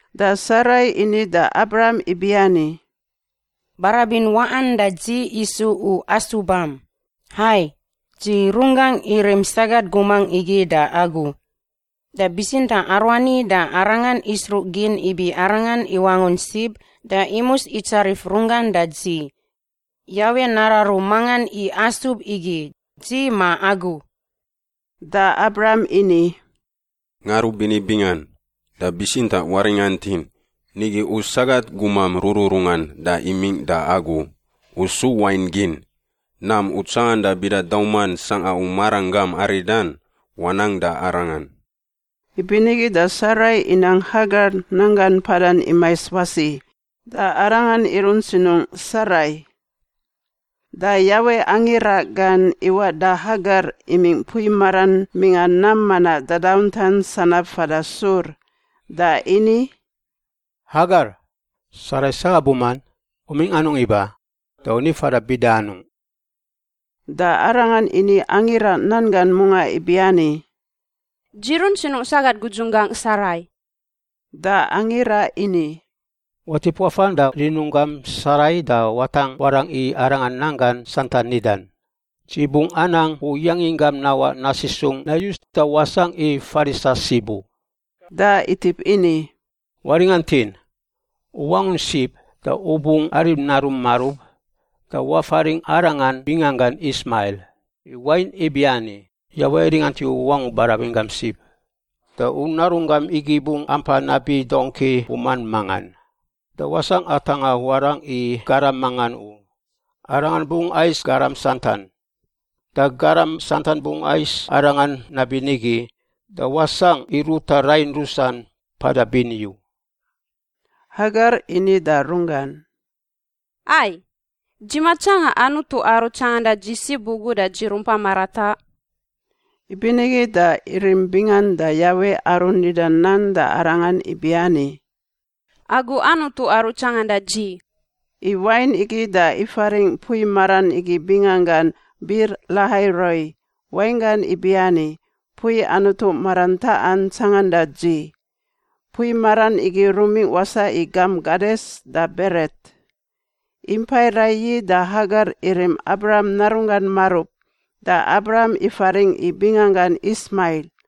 Da Sarai ini da Abram ibiani, “Barabin waꞌan da dzi isu u asubam. Hai, dzi runggangꞌ irim sagat gumangꞌ igi da agu. Da bitsintaꞌ aruani da arangan isruꞌgin ibi arangan iwangun sib da imus itsarif runggan da dzi. Yawe nararu mangan i asub igi, dzi ma agu.” Da Abram ini, “Ngarubini bingan! Da bitsintaꞌ waringantin, nigi u sagat gumam rururungan da imingꞌ da agu. U su wain gin. Nam u tsanganda bida dauman sangꞌa u maranggam aridan, wanang da arangan.” Ibinigi da Sarai inang Hagar nanggan mpadan imais wasi, da arangan irunt sinungꞌ Sarai. Da Yawe angira gan iwaꞌ da Hagar imingꞌ mpui maran mingꞌa nam manaꞌ dadauntan sanab fada Sur. Da ini, “Hagar, Sarai sagat guman, u mingꞌ anungꞌ iba, da u ni fada bida anungꞌ?” Da arangan ini angira nan gan mungaꞌ ibiani, “Dzi runt sinungꞌ sagat gudzunggangꞌ Sarai.” Da angira ini, “Watip wafan da rinunggam Sarai da watangꞌ warangꞌ i arangan nan gan santan nidan. Dzi bungꞌ anang u yanginggam nawaꞌ nasisungꞌ nayus da wasangꞌ i farisa sib u.” Da itip ini, “Waringantin! U wangun sib da u bungꞌ arim narun marub. Da wafaringꞌ arangan binganggan Ismail, i wain ibiani, Yawe iringant i u wangu barabin gam sib. Da u narunggam igi bungꞌ ampa nabi dongki buman mangan, da wasangꞌ atangꞌa warangꞌ i garam mangan u. Aranga bungꞌ ais garam santan, da garam santan bungꞌ ais arangan nabinigi. Da wasangꞌ i ruta rain rusan mpada bini u.” Hagar ini da runggan, “Ai! Dzi matsanga Anutu Aru Tsanganda Dzi sib ugu da dzi rumpa marataꞌ?” Ibinigi da irim bingan da Yawe aru nida nan da arangan ibiani, “Agu Anutu Aru Tsanganda Dzi.” I wain igi da ifaringꞌ mpui maran igi binganggan Bir-Lahai-Roi, wainggan ibiani Mpui Anutu Marantaꞌan Tsanganda Dzi. Mpui maran igi rumingꞌ wasaꞌ i gamp Kades da Beret. Impai raiyi da Hagar irim Abram narunggan marub, da Abram ifaringꞌ i binganggan Ismail.